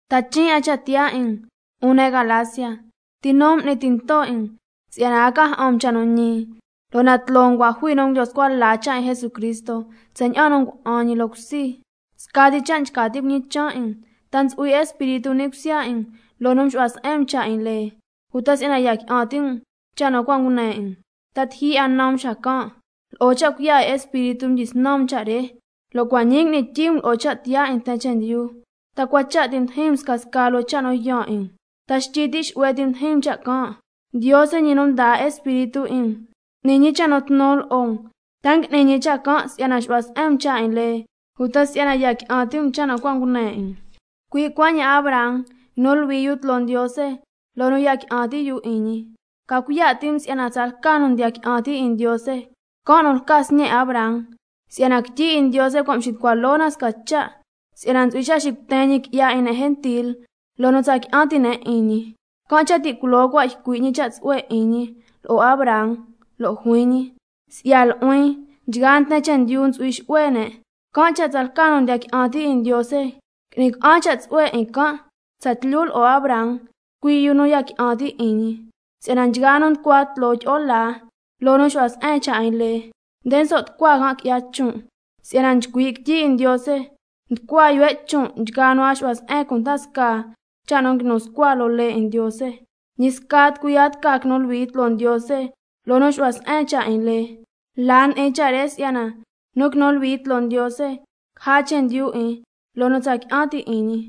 ¡Ta chin' 'a cha' tiyaa 'in um, 'un ne' Galacia! ¿Ti nu m'ni tinto 'in um si'yana a ca ja'an um cha' nu ñi? Lo' na tloo um cua' jui nu ngulyo scua la cha' 'in Jesucristo tsaña'an nu ngua'an ñi loo cusi. Scati cha' nchca tin' cuñichan' 'in um: ¿Ta ntsu'hui Espíritu ni' cusya 'in um loo nu mxu'hua se'en um cha' 'in lee, uta si'yana ya qui'an ti' um cha' nu cua' ngune 'in um? ¿Ta tiji 'a na um xacan'? Lo'o cha' cuiya' 'in Espíritu mdyisnan um cha' re, lo' cua' ñii ngui'ni tyii um lo'o cha' tiyaa 'in nten chendyu. ¿Ta cua cha' ti mdijin um scasca loo cha' nu yaan 'in um? ¿Ta xtyi ti' xu'hue ti mdijin um cha' can'? Ndiose, ñi nu ndaa Espíritu 'in um n'ni ñi cha' nu tnu lo'o um, ¿ta ngui'ni ñi cha' can' si'yana nxu'hua se'en um cha' 'in lee, uta si'yana ya qui'an ti' um cha' nu cua' ngune 'in um? Cui' cuaña'an Abraham —nguinu luhui yu tloo Ndiose loo nu ya qui'an ti' yu 'in ñi—. Ca cuiya' ti' um si'yana tsalca nu ndiya qui'an ti' 'in Ndiose, can' nu lca sñe' Abraham. Si'yana quityi 'in Ndiose cua' mxitucua loo na sca cha' si'yana ntsu'hui cha' xicuten ñi qui'ya 'in ne' gentil loo nu tsa qui'an ti' ne' 'in ñi, can' cha' ti' culoo cua' ycui' ñi cha' tsu'hue 'in ñi lo'o Abraham, lo' juin ñi: —Cui' si'ya nu'huin, can' cha' nchgaa nten chendyu ntsu'hui xu'hue ne'—. Can' cha' tsalca nu ndiya qui'an ti' 'in Ndiose ngui'ni ca'an cha' tsu'hue 'in can' tsatlyu lo'o Abraham, cui' yu nu ya qui'an ti' 'in ñi. Si'yana nchgaa nu nducua tloo tyi'o laa loo nu xu'hua se'en cha' 'in lee, nde nso' tucua can' qui'ya chon', si'yana nchcui' quityi 'in Ndiose: —Nducua yuhue' chon' nchgaa nu a nxu'hua se'en cunda scaa cha' nu nguinu scua loo lee 'in Ndiose—. Can' cha' ñi sca tucui a tca quinu luhui tloo Ndiose loo nu xu'hua se'en cha' 'in lee, la ndi'in cha' re si'yana: —Nu quinu luhui tloo Ndiose, caja chendyu 'in loo nu tsa qui'an ti' 'in ñi—.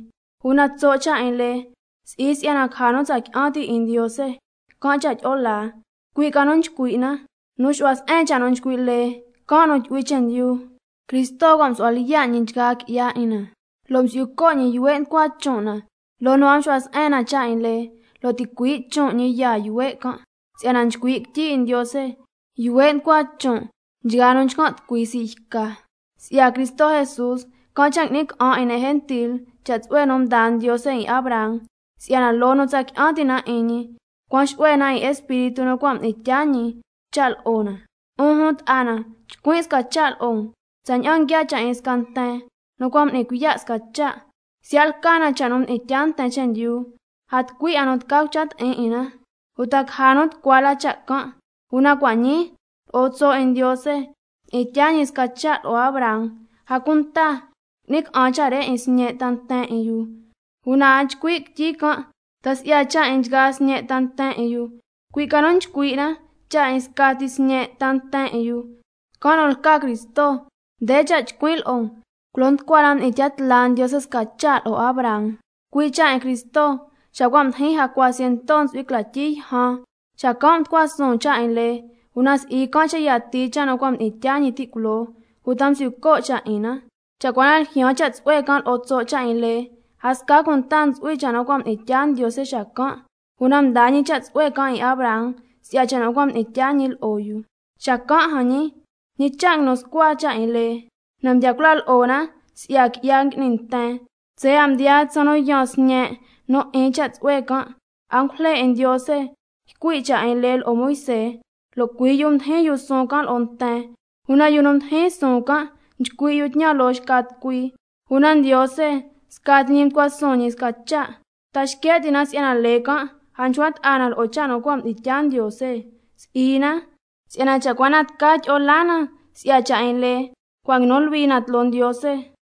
Una tso' cha' nu 'in lee, si'i si'yana caja nu tsa qui'an ti' 'in Ndiose can' cha' tyi'o laa, cui' ca nu nchcui' na: —Nu xu'hua se'en cha' nu nchcui' lee, can' nu tyu'hui chendyu—. Cristo cua' msu'hua lyiya' ñi nchgaa qui'ya 'in na lo' msi'yu co' ñi yuhue' nducua chon' na loo nu a mxu'hua se'en na cha' 'in lee, lo' ticuii' chon' ñi yaa yuhue' can', (si'yana nchcui' quityi 'in Ndiose: —Yuhue' nducua chon' nchgaa nu nchcan' tucui sii' yca—.) Si'ya Cristo Jesús, can' cha' qui'ni ca'an 'in ne' gentil cha' tsu'hue nu mdaa Ndiose 'in Abraham, si'yana loo nu tsa qui'an ti' na 'in ñi, cuan xu'hue na 'in Espíritu nu cua' mdi'in tyaa ñi cha' lo'o na. 'Un jun ta'a na, chcuin' sca cha' lo'o um tsaña'an nguiaa cha' 'in sca nten nu cua' m'ni cuiya' sca cha'. Siya' lca na cha' nu mdi'in tyaa nten chendyu, a tucui 'a nu tca cucha ti'in 'in na, uta caja nu tucua la cha' can'. Una cua' ñii lo'o tso' 'in Ndiose, mdi'in tyaa ñi sca cha' lo'o Abraham, a cunta qui'ni ca'an cha' re 'in sñe' ta nten 'in yu. Una a nchcui' quityi can' ta si'ya cha' 'in nchgaa sñe' ta nten 'in yu, cui' ca nu nchcui' na cha' 'in scati sñe' ta nten 'in yu, can' nu lca Cristo. Nde cha' nchcuin' lo'o um: Culo nducua la mdi'in tya tla Ndiose sca cha' lo'o Abraham, cui' cha' 'in Cristo, xa cua' mdijin jacua ciento ntsu'hui cla tyi yjan, xacan' mducua suun cha' 'in lee, una si'i can' cha' yatii cha' nu cua' mdi'in tyaa ñi ti' culoo, uta msi'yu co' cha' 'in na. Cha' cua na ljyaan cha' tsu'hue can' lo'o tso' cha' 'in lee, a sca cunta ntsu'hui cha' nu cua' mdi'in tya Ndiose xacan', una mdaa ñi cha' tsu'hue can' 'in Abraham si'ya cha' nu cua' mdi'in tyaa ñi lo'o yu. Ñi cha' nguinu scua cha' 'in lee Xacan' jan ñi, ¿Ñi cha' nguinu scua cha' 'in lee? Na mdya cula lo'o na si'ya qui'ya ngui'ni nten, tsaya' mdiyaa tsaan nu yaan sñe' nu 'in cha' tsu'hue can'. Angujle 'in Ndiose ycui' cha' 'in lee lo'o Moisé, lo' cui' yu mdijin yu suun can' lo'o nten. Una yu nu ndijin suun lo'o nten, cui' si'yana nchcui' yu cha' nu ycui' xca tucui, una Ndiose scati ñi ndi'in tya ñi sca cha'. ¿Ta xque' ti' na si'yana lee can' a nchcua ta'a na lo'o cha' nu cua' mdi'in tya Ndiose? Si'i na. Si'yana cha' cua na tca tyi'o laa na si'ya cha' 'in lee, a s'ni quinu luhui na tloo Ndiose xacan'.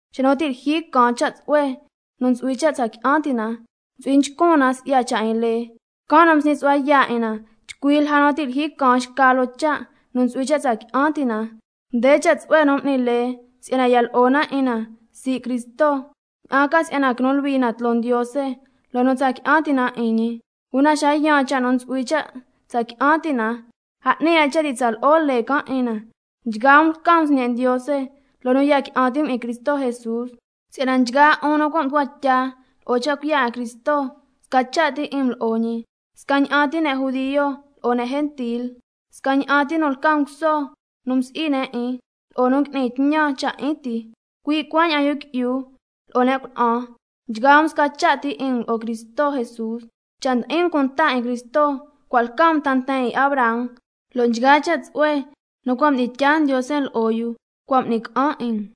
Xa nu ti' lyijyi caan cha' tsu'hue nu ntsu'hui cha' tsa qui'an ti' na, ntsu'hui nchcun na si'ya cha' 'in lee, can' nu msñi su'hua yaa' 'in na chcui lja nu ti' lyijyi ca chcan' loo cha' nu ntsu'hui cha' tsa qui'an ti' na. Nde cha' tsu'hue nu m'ni lee si'yana ya lo'o na 'in na sii' Cristo, ña'an ca si'yana quinu luhui na tloo Ndiose loo nu tsa qui'an ti' na 'in ñi. Lo' xa cua' mdiyaan cha' nu ntsu'hui cha' tsa qui'an ti' na, a 'ni 'a cha' ti' tsa lo'o lee can' 'in na. Nchgaa um cua' lca um sñe' Ndiose loo nu ya qui'an ti' um 'in Cristo Jesús, si'yana nchgaa 'un nu cua' mducua tya lo'o cha' cuiya' 'in Cristo, sca cha' ti' 'in um lo'o ñi. Scaña'an ti ne' judio lo'o ne' gentil, scaña'an ti nu lca nguso nu msi'i ne' 'in lo'o nu ngui'ni tñan cha' 'in ti, cui' cuaña'an yu qui'yu lo'o ne' cuna'an, sca cha' ti 'in um nchgaa um lo'o Cristo Jesús. Cha' ndi'in um cunta 'in Cristo, cua' lca um ta nten 'in Abraham, lo' nchgaa cha' tsu'hue nu cua' mdi'in tyaa Ndiose lo'o yu cua' m'ni ca'an 'in um.